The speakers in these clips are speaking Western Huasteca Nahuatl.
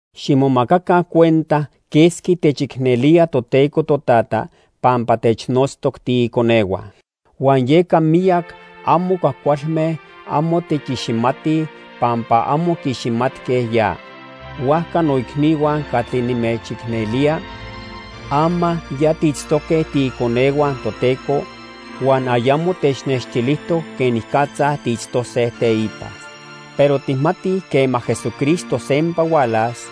Ximomacaca cuenta quesqui techicnelía Toteco Totata pampa technotztoc tiiconehua. Huan yeca miyac amo cuajcualme amo techiximatij pampa amo quiiximatque ya. Huajca noicnihua catli nimechicnelía, ama ya tiitztoque tiiconehua Toteco, huan ayamo technextilijtoc quenicatza tiitztose teipa. Pero tijmatij quema Jesucristo sempa hualas,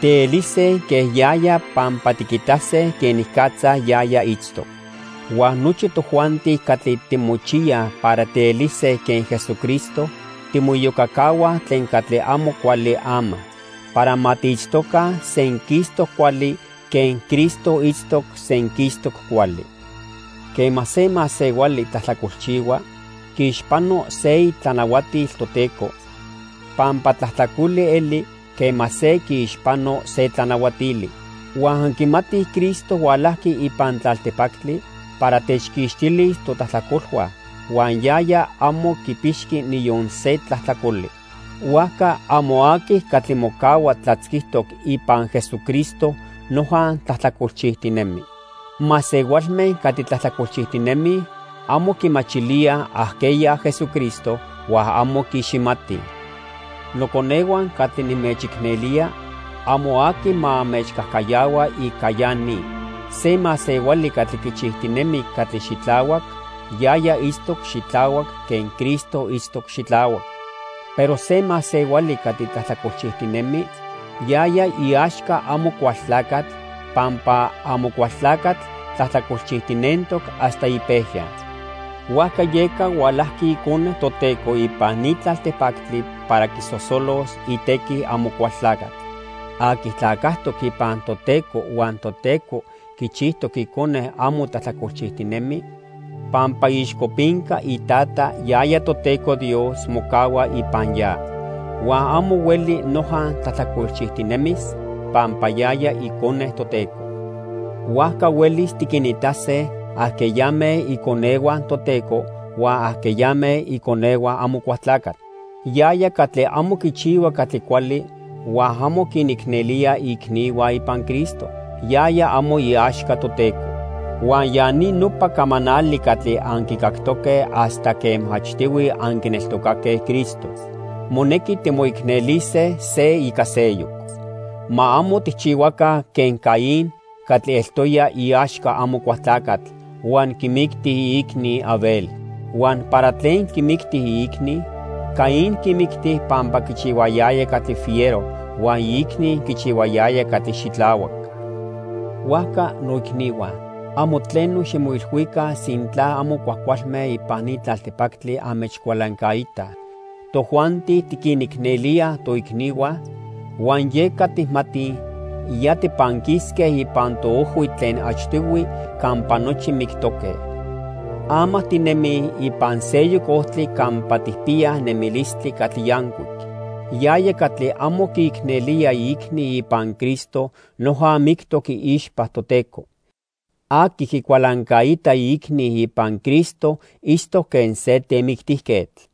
tielise quen yaya pampa tiquitase quenicatza yaya itztoc. Huan nochi tojuanti catli timochiyaj para tielise quen Jesucristo timoiyocacahuaj tlen catli amo cuali ama, para ma tiitztoca senquistoc cuali quen Cristo itztoc senquistoc cuali. Quema se masehuali tlajtlacolchihua, quiixpano se itlanahuatil Toteco, pampa tlajtlacoli eli quema se quiixpano se tlanahuatili. Huan anquimatij Cristo hualajqui ipan tlaltipactli para techquixtilis totlajtlacolhua, huan yaya amo quipixqui niyon se tlajtlacoli. Huajca amo aqui catli mocahua tlatzquitoc ipan Jesucristo noja tlajtlacolchijtinemi. Masehualme catli tlajtlacolchijtinemij amo quimachilíaj ajqueya Jesucristo huan amo quiiximatij. Noconehua catli nimechicnelía, amo aqui ma anmechcajcayahua ica ya ni. Se masehuali catli quichijtinemi catli xitlahuac, yaya itztoc xitlahuac quen Cristo itztoc xitlahuac. Pero se masehuali catli tlajtlacolchijtinemi, yaya iaxca Amocualtlacatl, pampa Amocualtlacatl tlajtlacolchijtinentoc hasta ipejya. Huajca yeca hualajqui Icone Toteco ipan ni tlaltipactli para quisosolos itequi Amocualtlacatl. Aqui tlacajtoc ipan Toteco huan Toteco quichijtoc icone amo tlajtlacolchijtinemi, pampa iixcopinca iTata, yaya Toteco Dios, mocahua ipan ya. Huan amo hueli noja tlajtlacolchijtinemis pampa yaya icone Toteco. Huajca huelis tiquinitase ajqueyame iconehua Toteco huan ajqueyame iconehua Amocualtlacatl. Yaya catli amo quichihua catli cuali huan amo quinicnelía iicnihua ipan Cristo, yaya amo iaxca Toteco. Huan ya ni nopa camanali catli anquicactoque hasta quema achtihui anquineltocaque Cristo: monequi timoicnelise se ica seyoc. Ma amo tijchihuaca quen Caín catli eltoya iaxca Amocualtlacatl huan quimicti iicni, Abel. Huan ¿para tlen quimicti iicni? Caín quimicti pampa quichihuayaya catli fiero huan iicni quichihuayaya catli xitlahuac. Huajca noicnihua, amo tleno ximoilhuica sintla amo cuajcualme ipan ni tlaltipactli anmechcualancaitaj. Tojuanti tiquinicnelíaj toicnihua, huan yeca tijmatij ya tipanquisque ipan toojhui tlen achtihui campa nochi mictoque. Ama tinemij ipan seyoc ojtli campa tijpiyaj nemilistli catli yancuic. Yaya catli amo quiicnelía iicni ipan Cristo noja mictoc iixpa Toteco. Aqui quicualancaita iicni ipan Cristo itztoc quen se temictijquetl.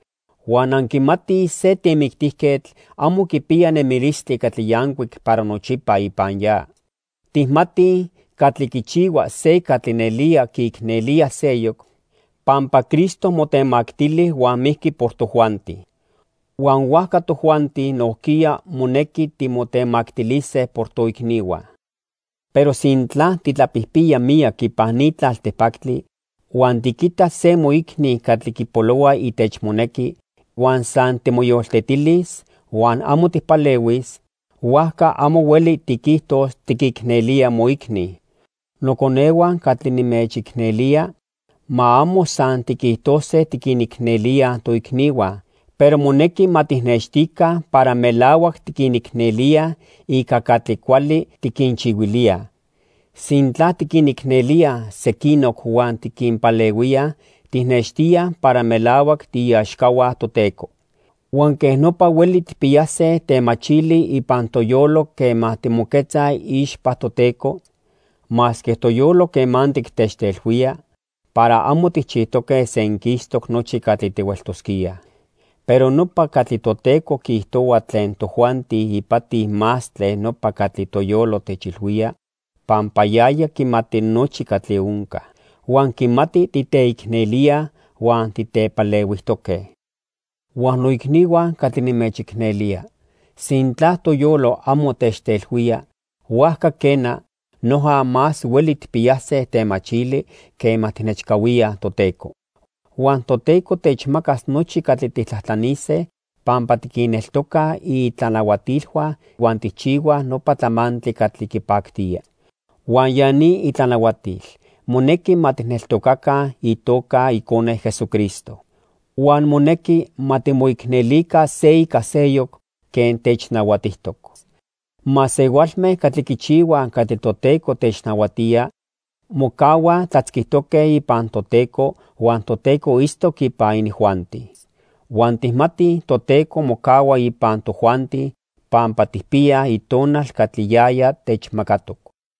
Huan anquimatij se temictijquetl amo quipiya nemilistli catli yancuic para nochipa ipan ya. Tijmatij catli quichihua se catli nelía quiicnelía seyoc, pampa Cristo motemactili huan mijqui por tojuanti. Huan huajca tojuanti nojquiya, monequi timotemactilise por toicnihua. Pero sintla titlapijpiya miyac ipan ni tlaltipactli, huan tiquitas se moicni catli quipolohua itechmonequi, huan san timoyoltetilis huan amo tijpalehuis, huajca amo hueli tiquijtos tiquicnelía moicni. Noconehua catli nimechicnelía, ma amo san tiquijtose tiquinicnelíaj toicnihua, pero monequi ma tijnextica para melahuac tiquinicnelíaj ica catli cuali tiquinchihuilíaj. Sintla tiquinicnelíaj sequinoc huan tiquinpalehuíaj, tijnextíaj para melahuac tiiaxcahua Toteco. Huan quej nopa hueli tijpiyase temachili ipan toyolo quema timoquetzaj iixpa Toteco, masque toyolo quemantic techtelhuía para amo tijchijtoque senquistoc nochi catli tihueltosquíaj. Pero nopa catli Toteco quiijtohua tlen tojuanti ipati más tlen nopa catli toyolo techilhuía, pampa yaya quimati nochi catli onca. Huan quimati titeicnelíaj huan titepalehuijtoque. Huan noicnihua catli nimechicnelía, sintla toyolo amo techtelhuía, huajca quena, noja más hueli tijpiyase temachili quema tijnechcahuía Toteco. Huan Toteco techmacas nochi catli tijtlajtlanise pampa tiquinneltocaj itlanahuatilhua huan tijchihuaj nopa tlamantli catli quipactía. Huan ya ni itlanahuatil: Monequi ma tijneltocaca itoca Icone, Jesucristo. Huan monequi ma timoicnelica se ica seyoc quen technahuatijtoc. Masehualme catli quichihuaj catli Toteco technahuatía mocahuaj tlatzquitoque ipan Toteco huan Toteco itztoc ipan inijuanti. Huan tijmatij Toteco mocahua ipan tojuanti pampa tijpiyaj Itonal catli yaya techmacatoc.